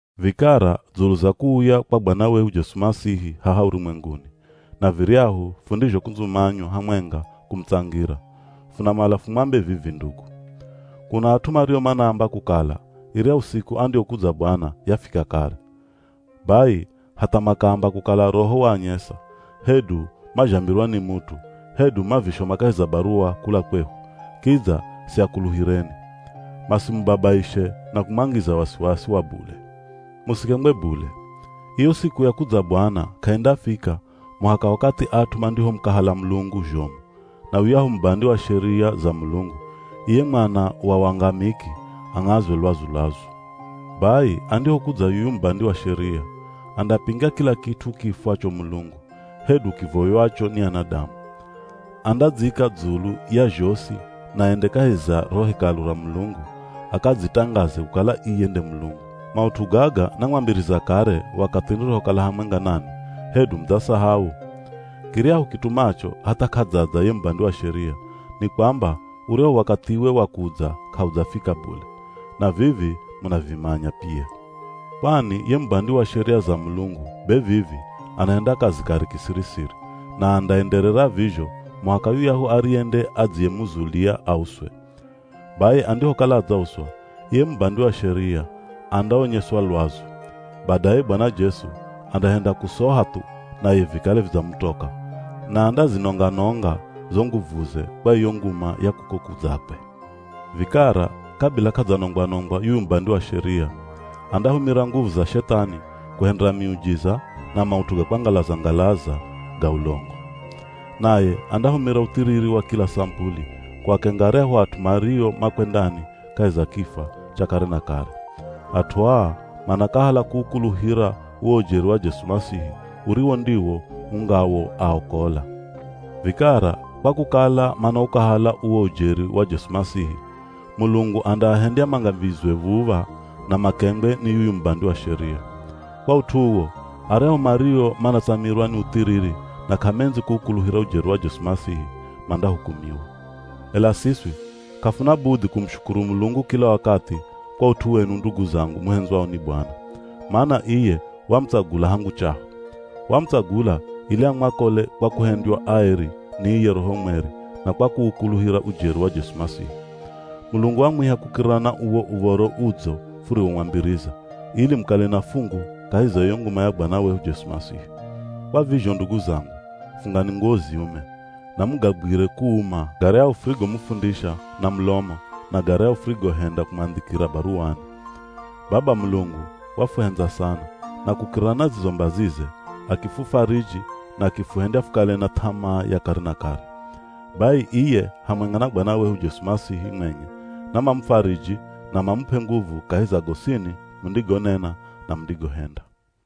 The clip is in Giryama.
Vikara dzulu za kuuya kwa Bwana wehu Jesu Masihi haha urumwenguni, na viryahu fundizhokundzumanywa hamwenga kumutsangira, funamala fumwambe vivi ndugu: Kuna at'u mario manaamba kukala iryahu siku andiyokudza Bwana, yafika kare. Bai hatha makaamba kukala Roho waanyesa, hedu mazhambirwa ni mut'u, hedu mavishoma kahi za baruwa kula kwehu, kidza siakuluhireni. Masimubabaishe na kumwangiza wasiwasi wa bule. Musikengwe bule, iyo siku ya kudza Bwana k'aindafika muhaka wakathi at'u mandihomukahala Mulungu zhomu, na yuyahu Mubandi wa Sheria za Mulungu, iye mwana wa wangamiki ang'azwe lwazu-lwazu. Bai andihokudza yuyu Mubandi wa Sheria, andapinga kila kit'u kiifwacho mulungu, hedu kivoywacho ni anadamu. Andadzika dzulu ya zhosi na ende kahi za ro Hekalu ra Mulungu, akadzitangaze kukala iye nde Mulungu. Maut'u gaga namwambiriza kare wakathi nirihokala hamwenga nanwi, hedu mudzasahau? Kiryahu kitumacho hatha k'adzadza ye Mubandi wa Sheria, ni kwamba uryahu wakathiwe wa kudza k'audzafika bule. Na vivi munavimanya pia. Kwani ye mubandi wa sheria za Mulungu be vivi anahenda kazi kare kisiri-siri, na andaenderera vizho muhaka yuyahu ariye nde adziyemuzulia auswe. Bai andihokala adzauswa, iye Mubandi wa Sheria andaonyeswa lwazu. Badaye Bwana Jesu andahenda kusoha thu naye vikale vidzamutoka, na andazinonga nonga zo nguvuze kwa iyo nguma ya kuko kudzakwe. Vikara kabila k'adzanongwa-nongwa yuyu Mubandi wa Sheria, andahumira nguvu za Shethani kuhendera miujiza na maut'u ga kwangalaza-ngalaza ga ulongo. Naye andahumira uthiriri wa kila samupuli kuakenga aryahu at'u mario makwendani kahi za kifwa cha kare na kare. At'u aa manakahala kuukuluhira uwo ujeri wa Jesu Masihi uriwo ndiwo ungawoaokola. Vikara kwa kukala manaukahala uwo ujeri wa Jesu Masihi, Mulungu andaahendya mangamizwe v̱uv̱a na makengwe ni yuyu Mubandi wa Sheria. Kwa ut'u uwo, aryahu mario manatsamirwa ni uthiriri na k'amendzi kuukuluhira ujeri wa Jesu Masihi, mandahukumiwa. Ela siswi k'afuna budhi kumushukuru Mulungu kila wakathi kwa ut'u wenu ndugu zangu muhendzwao ni Bwana, mana iye wamutsagula hangu chaho. Wamutsagula ili amwakole kwa kuhendywa aeri ni iye Roho Mweri na kwa kuukuluhira ujeri wa Jesu Masihi. Mulungu wamwiha kukirira na uwo Uv̱oro Udzo furiwomwambiriza, ili mukale na fungu kahi za iyo nguma ya Bwana wehu Jesu Masihi. Kwa vizho ndugu zangu, fungani nguwo ziume, na mugagwire kuuma garyahu furigomufundisha na mulomo na garyahu furigohenda kumwandhikira baruwani. Baba Mulungu wafuhendza sana na kukirira na zizo mbazize, akifufariji na akifuhendya fukale na th'amaa ya kare na kare. Bai, iye hamwenga na Bwana wehu Jesu Masihi mwenye namamufariji na mamup'e nguvu kahi za gosini mundigonena na mundigohenda.